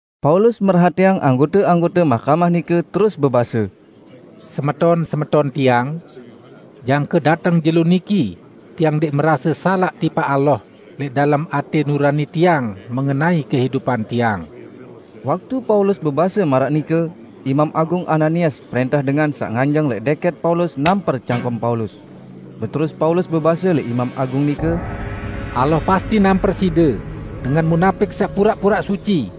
Paulus merhatiang anggote-anggote mahkamah nike terus bebase, "Semeton-semeton tiang! Jangke dateng jelo niki tiang ndẽq merase salaq tipaq Allah lẽq dalem atẽ nurani tiang mengenai kehidupan tiang." Waktu Paulus bebase maraq nike, Imam Agung Ananias prẽntah dengan saq nganjeng lẽq dẽkẽt Paulus namper cangkem Paulus. Beterus Paulus bebase lẽq imam Agung nike, "Allah pasti namper side, dengan munapik saq puraq-puraq suci!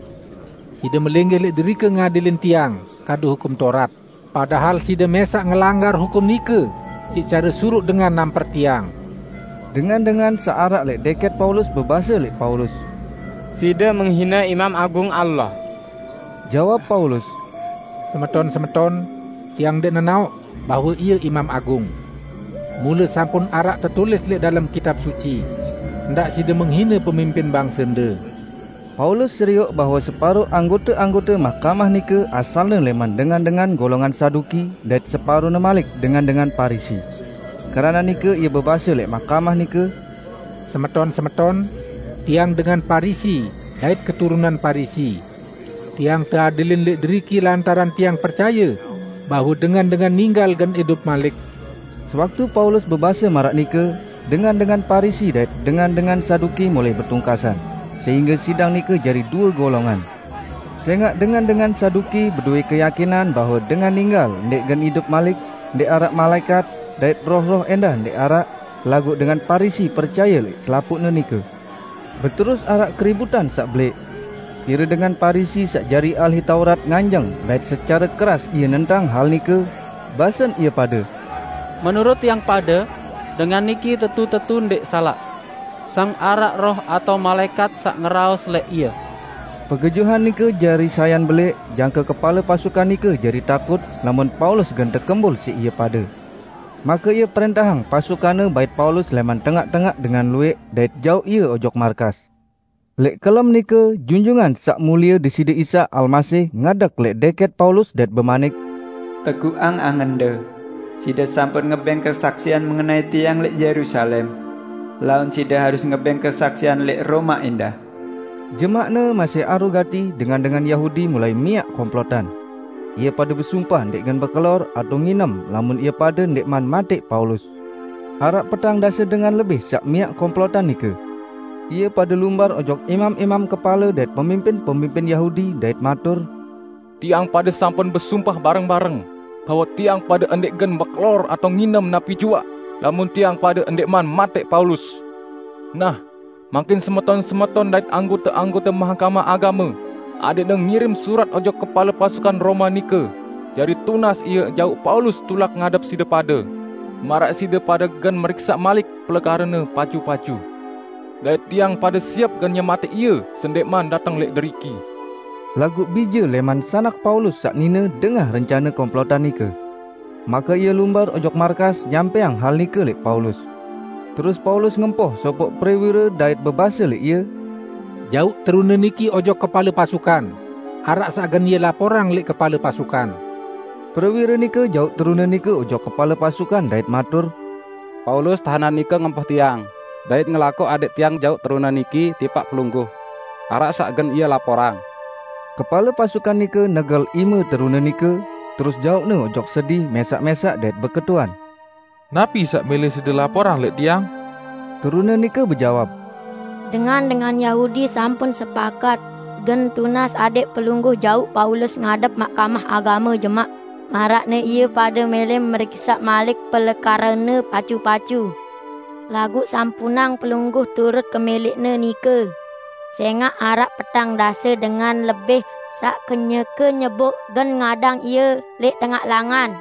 Side melinggih lẽq derike ngadilin tiang kadu Hukum Taurat, padahal side mẽsaq ngelanggar hukum nike siq care suruq dengan namper tiang!" Dengan-dengan saq araq lẽq dẽkẽt Paulus bebase lẽq Paulus, "Side menghine imam Agung Allah!" Jawab Paulus, "Semeton-semeton, tiang ndẽq nenaoq, bahwe ie imam agung. Mule sampun araq tetulis lẽq dalem Kitab Suci, 'Ndaq side menghine pemimpin bangsende.' " Paulus serioq bahwe separo anggote-anggote mahkamah nike asalne lẽman dengan-dengan golongan Saduki dait separone malik dengan-dengan Parisi. Keranaq nike ie bebase lẽq mahkamah nike, "Semeton-semeton, tiang dengan Parisi dait keturunan Parisi, tiang teadilin lẽq deriki lantaran tiang percaye bahwe dengan-dengan ninggal gen idup malik." Sewaktu Paulus bebase maraq nike, dengan-dengan Parisi dait dengan-dengan Saduki mulai betungkasan, sehingge sidang nike jari due golongan. ( Sẽngaq dengan-dengan Saduki bedowẽ keyakinan bahwe dengan ninggal ndẽq gen idup malik, ndẽq araq malaẽkat, dait roh-roh ẽndah ndẽq araq, laguq dengan Parisi percaye lẽq selapuqne nike.) Beterus araq keributan saq belẽq. Pire dengan Parisi saq jari ahli taurat nganjeng dait secare keras ie nentang hal nike, basen ie pade, "Menurut tiang pade dengan niki tetu-tetu ndẽq salaq! Sang araq roh atao malaẽkat saq ngeraos lẽq ie!" Pegejuhan nike jari sayan belẽq jangke kepale pasukan nike jari takut lamun Paulus gen tekembul siq ie pade. Make ie prẽntahang pasukanne bait Paulus lẽman tengaq-tengaq dengan luwẽq dait jauq ie ojok markas. Lẽq kelem nike, Junjungan Saq Mulie Deside Isa Almasih ngadeg lẽq dẽkẽt Paulus dait bemanik, "Teguqang angende! Side sampun ngebẽng kesaksian mengenai Tiang lẽq Yerusalem. Laun side harus ngebẽng kesaksian lẽq Roma ẽndah." Jemaqne masih aru gati, dengan-dengan Yahudi mulai miaq komplotan. Ie pade besumpah ndẽq gen bekelor atao nginem lamun ie pade ndẽqman matẽq Paulus. Araq petang dase dengan lebih saq miaq komplotan nike. Ie pade lumbar ojok imam-imam kepale dait pemimpin-pemimpin Yahudi dait matur, "Tiang pade sampun besumpah bareng-bareng, bahwe tiang pade ndẽq gen bekelor atao nginem napi juaq lamun tiang pade ndẽqman matẽq Paulus. Nah, mangkin semeton-semeton dait anggote-anggote Mahkamah Agame adẽqne ngirim surat ojok kepale pasukan Roma nike jari tunas ie jauq Paulus tulak ngadep side pade, maraq side pade gen meriksaq malik pelekarene pacu-pacu. Dait tiang pade siep gen nyematẽq ie sendẽqman dateng lẽq deriki." Laguq bije lẽman sanak Paulus saq nine dengah rencane komplotan nike. Make ie lumbar ojok markas nyampẽang hal nike lẽq Paulus. Terus Paulus ngempoh sopoq prewire dait bebase lẽq ie, "Jauq terune niki ojok kepale pasukan, araq saq gen ie laporang lẽq kepale pasukan." Prewire nike jauq terune nike ojok kepale pasukan dait matur, "Paulus, tahenan nike ngempoh tiang, dait ngelakoq adẽq tiang jauq terune niki tipaq pelungguh; araq saq gen ie laporang." Kepale pasukan nike negel ime terune nike, terus jauqne ojok sedi mẽsaq-mẽsaq dait beketuan, "Napi saq mẽlẽ side laporang lẽq tiang?" Terune nike bejawab, "Dengan-dengan Yahudi sampun sepakat gen tunas adẽq pelungguh jauq Paulus ngadep Mahkamah Agame jemaq, maraqne ie pade mẽlẽ meriksaq malik pelekarene pacu-pacu. Laguq sampunang pelungguh turut kemẽlẽqne nike, sẽngaq araq petang dase dengan lebih saq kenyeke nyeboq gen ngadang ie lẽq tengaq langan.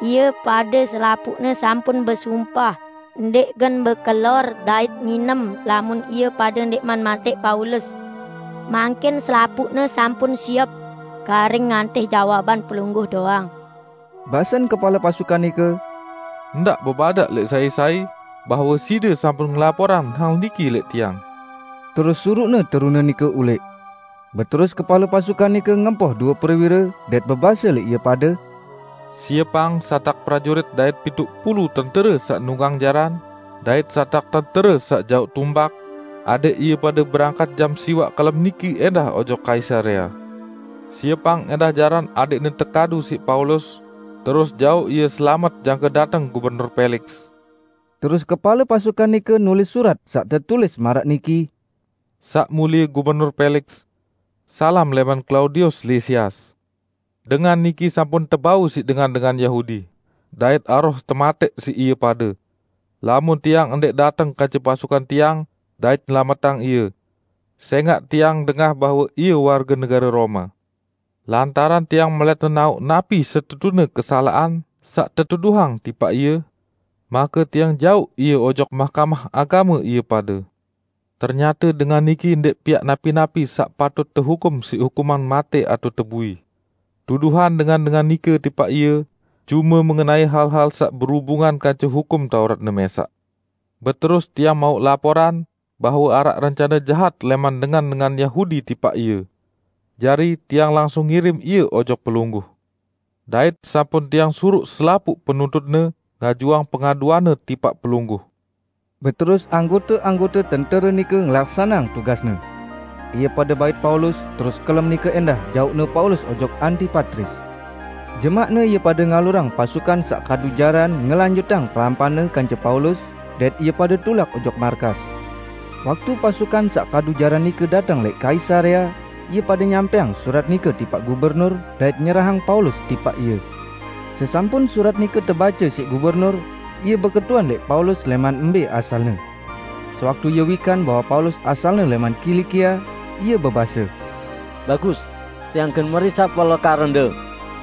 Ie pade selapuqne sampun besumpah ndẽq gen bekelor dait nginem lamun ie pade ndẽqman matẽq Paulus. Mangkin selapuqne sampun siep; karing ngantih jawaban pelungguh doang." Basen kepale pasukan nike, "Ndaq bebadaq lẽq sai-sai bahwe side sampun ngelaporang hal niki lẽq tiang." Terus suruqne terune nike ulẽq. Beterus kepale pasukan nike ngempoh due prewire, dait bebase lẽq ie pade, "Siepang satak prajurit dait pituq pulu tentere saq nunggang jaran dait satak tentere saq jauq tumbak, adẽq ie pade berangkat jam siwaq kelem niki ẽndah ojok Kaisarea. Siepang ẽndah jaran adẽqne tekadu siq Paulus terus jauq ie selamet jangke dateng Gubernur Peliks." Terus kepale pasukan nike nulis surat saq tetulis maraq niki, "Saq Mulie Gubernur Peliks. Salam lẽman Klaudius Lisias! Dengan niki sampun tebau siq dengan-dengan Yahudi dait aroh tematẽq siq ie pade, lamun tiang ndẽq dateng kance pasukan tiang dait nyelametang ie; sẽngaq tiang dengah bahwe ie warge negare Roma. Lantaran tiang melẽt nenaoq napi setetune kesalaqan saq tetuduhang tipaq ie, make tiang jauq ie ojok Mahkamah Agame ie pade. Ternyate dengan niki ndẽq piaq napi-napi saq patut tehukum siq hukuman matẽ atao tebui. Tuduhan dengan-dengan nike tipaq ie cume mengenai hal-hal saq berubungan kance Hukum Tauratne mẽsaq. Beterus tiang mauq laporan bahwe araq rencane jahat lẽman dengan-dengan Yahudi tipaq ie, jari tiang langsung ngirim ie ojok Pelungguh, dait sampun tiang suruq selapuq penuntutne ngajuang pengaduanne tipaq pelungguh." Beterus anggote-anggote tentere nike ngelaksaneang tugasne. Ie pade bait Paulus, terus kelem nike ẽndah jauqne Paulus ojok Antipatris. Jemaqne ie pade ngalurang pasukan saq kadu jaran ngelanjutang kelampanne kance Paulus, dait ie pade tulak ojok markas. Waktu pasukan saq kadu jaran nike dateng lẽq Kaisarea, ie pade nyampẽang surat nike tipaq Gubernur, dait nyerahang Paulus tipaq ie. Sesampun surat nike tebace siq Gubernur, ie beketuan lẽq Paulus lẽman mbẽ asalne. Sewaktu ie wikan bahwe Paulus asalne lẽman Kilikia, ie bebase, "Bagus! Tiang gen meriksaq pelekarende,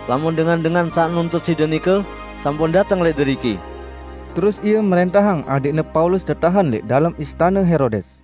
lamun dengan-dengan saq nuntut side nike sampun dateng lẽq deriki." Terus ie mrẽntahang adẽqne Paulus tetahen lẽq dalem istane Herodes.